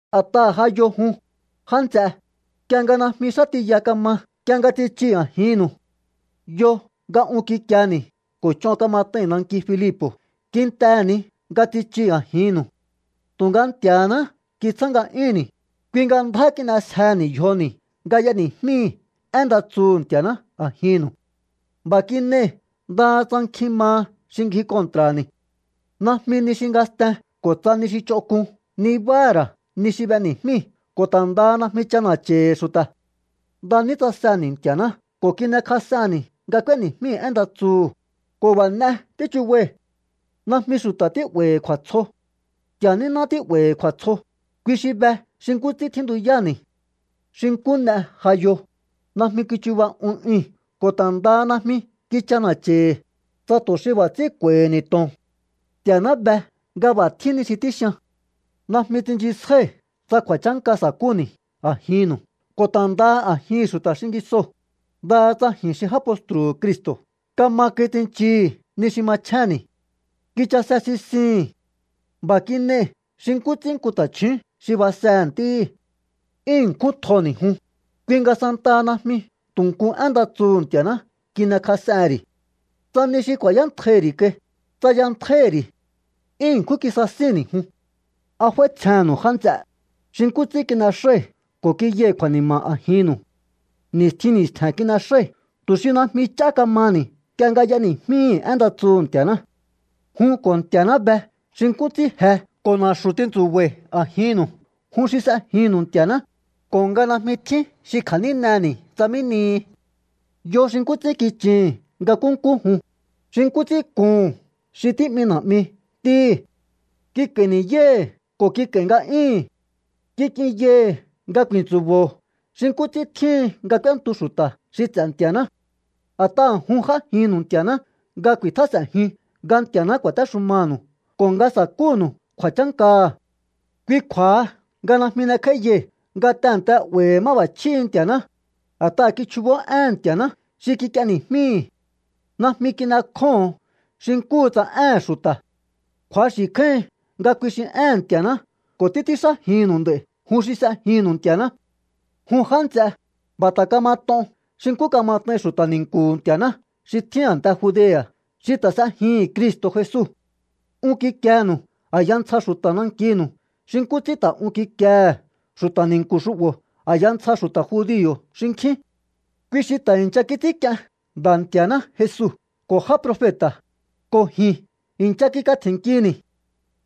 A̱t'aha̱ ja yo jun, já nts'e, nk'ie nga najmi xá tiya kama nk'ie nga tsichii̱ a̱jinnu̱u. Yo nga un kikieni̱ ko̱ ch'on kamat'ai̱n nanki Filipo̱ kintehe̱ ni nga tsichii̱ a̱jinnu̱u. Tu̱nga Nti̱a̱náhá kitsjá nga'yúnni̱, kui nga ndjá kin'esjehe̱ni̱ yjoni̱ nga y'eni̱jmíi̱ én nda tsuhu̱ Nti̱a̱ná a̱jinnu̱u. B'a̱ kin'ei̱ ndaha tsa nkjin maha xi ngji kontra̱ni̱. Najmi ni xi ngasten ko̱ tsa ni xi ch'onk'un nibáha̱ ra̱ ni xi b'eni̱jmíi̱ ko̱ ta̱ ndaha najmi ch'ana̱cha̱i̱hi̱ xu̱ta̱. Nda ní tsaseni̱ Nti̱a̱ná ko̱ kin'ekjas'enni̱ nga k'úéni̱jmíi̱ én nda tsuhu̱, ko̱ b'a̱ n'e tíchubai̱. Najmi xu̱ta̱ tí'ba̱i̱hi̱ kju̱a̱tsjo. Nti̱a̱ níná tí'ba̱i̱hi̱ kju̱a̱tsjo, kui xi be xi nkú ts'ín tjíntuyáni̱. Xi nkú n'e ja yo, najmi kichuba un ui̱n ko̱ ta̱ ndaha najmi kich'ana̱cha̱i̱hi̱, tsa tu̱ xi b'a̱ ts'ín kju̱a̱i̱hi̱ni̱ to̱on. Nti̱a̱ná be nga b'a̱ tjín ni xi tíxian. Najmi tsinchisjái̱ tsa kju̱a̱chánka sa̱kúni̱ a̱jinnu̱u ko̱ ta̱ ndaha a̱jihi̱n xu̱ta̱ xingisoo̱, ndaha tsa ji̱n xi já postru̱hu̱ Cristo̱ kama kai tsinchii̱hi̱ ni xi machjénni̱. Kichase sisii̱hi̱n. B'a̱ kin'ei̱ xi nkú ts'ín nku ta̱chju̱ún xi basehe̱ ntíhi̱. 'Yún ṉkjún tjoni̱ jun, kui nga santaha najmi tu̱ nku én nda tsuhu̱ Nti̱a̱ná kin'ekjas'ehe̱n ri̱. Tsa ni xi ku̱a̱yántjaihi̱ ri̱ kai, tsayantjáíhi̱ ri̱. 'Yún ṉkjún kisasíni̱ jun. ¿A f'áítsjennu̱u, já nts'e, xi nkú ts'ín kin'exái̱ ko̱ kiyai̱ kju̱a̱ni̱ma̱ a̱jinnu̱u? Ni̱stjin ni̱stje̱n kin'exái̱ tu̱ xi najmi ch'á ka̱maha̱ni̱ nk'ie nga y'eni̱jmíi̱hi̱ én nda tsuhu̱ Nti̱a̱ná. Jun ko̱ Nti̱a̱ná be xi nkú ts'ín je ko̱ na̱xu̱ tintsu̱ba̱i̱ a̱jinnu̱u jun xi s'ejinnu̱u Nti̱a̱ná, ko̱ nga najmi tjín xi kja̱níneni̱ tsa mí nihi. Yo xi nkú ts'ín kichii̱hi̱n nga nkúnkú jun, xi nkú ts'ín kuhu̱n xi tí'mi na̱'mi ntíhi̱. Kik'a̱i̱ ni̱yái̱hi̱ ko̱ kik'a̱i̱ nga'yíi̱hi̱n. Kik'inyai̱hi̱ nga ku̱i̱ntsu̱bo̱o xi nkú ts'ín tjíhin nga k'úéntu xu̱ta̱ xi ts'e̱ Nti̱a̱ná. A̱t'aha̱ jun j'ájinnu̱u Nti̱a̱ná nga ku̱i̱tjás'e̱njiun nga Nti̱a̱ná ku̱a̱téxumanu̱u ko̱ nga sa̱kúnu̱u kju̱a̱chánkaha̱. Kui kju̱a̱ha nga najmi n'ekj'áíyai̱ nga tehe̱nte 'ba̱i̱hi̱ máb'a̱chjíhi̱ Nti̱a̱ná, a̱t'aha̱ kichjubó éhe̱n Nti̱a̱ná xi kik'ieni̱jmíi̱. Najmi kin'ekjóho̱on xi nkúhu tsa éhe̱n xu̱ta̱. Kju̱axi̱ kjáíhin nga kui xi éhe̱n Nti̱a̱ná ko̱ títs'ínxájinnu̱u nd'a̱i̱ jun xi s'ejinnu̱u Nti̱a̱ná. Jun já nts'e, b'a̱ ta̱ kamat'on xi nkú kamat'ain xu̱ta̱ ni̱nku̱hu̱ Nti̱a̱ná xi tjín a̱nte Judea̱ xi ta̱ s'ejihi̱n Cristo̱ Jesu. Un kikienu̱u a̱ya ntsja xu̱ta̱ nankinu̱u xi nkú ts'ín ta̱ un kikiehe̱ xu̱ta̱ ni̱nku̱ xu'bo̱ a̱ya ntsja xu̱ta̱ judio̱ xinkjín. Kui xi ta̱ i̱ncha kits'ínk'ien Nda̱ Nti̱a̱ná Jesu ko̱ já profeta̱, ko̱ ji̱n i̱ncha kikatje̱nnkini̱.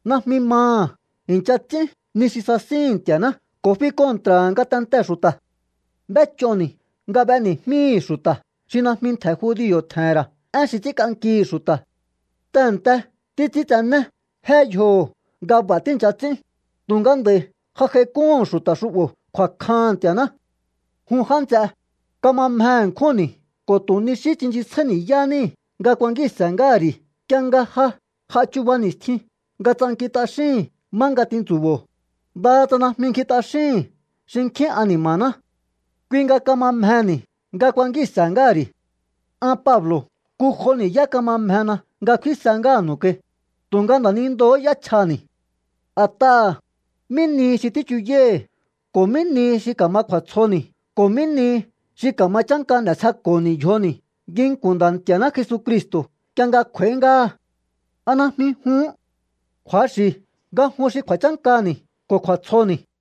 Najmi maha̱ i̱ncha ts'ín ni xi sasíhi̱n Nti̱a̱ná ko̱ fi kontra̱ha̱ ngatentee̱ xu̱ta̱. B'éch'oni̱ nga b'eni̱jmíi̱hi̱ xu̱ta̱ xi najmi ntje̱ judio̱ tje̱he̱n ra̱ én xi ts'ínk'ankihi̱ xu̱ta̱. Tehe̱nte títs'íntsené jé yjoho̱ nga b'a̱ tíi̱ncha ts'ín, tu̱nga nd'a̱i̱ ja j'aik'úhu̱n xu̱ta̱ xu'bo̱ kju̱a̱kjaha̱n Nti̱a̱ná. Jun já nts'e, kama mje ṉkjúnni̱ ko̱ tu̱ ni xí tsinchisjáí ni̱yá níi̱ nga kuankíi̱nse̱ ngáha̱ ri̱ nk'ie nga ja j'a chuba ni̱stjin nga tsankin t'axíi̱n má nga tintsu̱bo̱o, ndaha tsa najmi ngji t'axíhi̱n xinkjín ani̱ma̱ná. Kui nga kama mjehe̱ni̱ nga kuankíi̱nse̱ ngáha̱ ri̱. An Pablo̱ nku jo ni̱yá kama mjena nga kfínse ngáha̱nu̱u kai, tu̱nga nda̱nindoo̱hó y'échjani̱. A̱t'aha̱, ¿mí nihi xi tíchuyái̱hi̱ ko̱ mí nihi xi ka̱ma kju̱a̱tsjoni̱ ko̱ mí nihi xi ka̱ma chánka n'e̱sjeko̱ho̱ni̱ yjoni̱ nginku̱n Nda̱ Nti̱a̱ná Jesucristo̱ nk'ie nga kj'u̱a̱í ngáha? ¿A najmi juhún? Kju̱axi̱ nga jun xi kju̱a̱chánkani̱ ko̱ kju̱a̱tsjoni̱.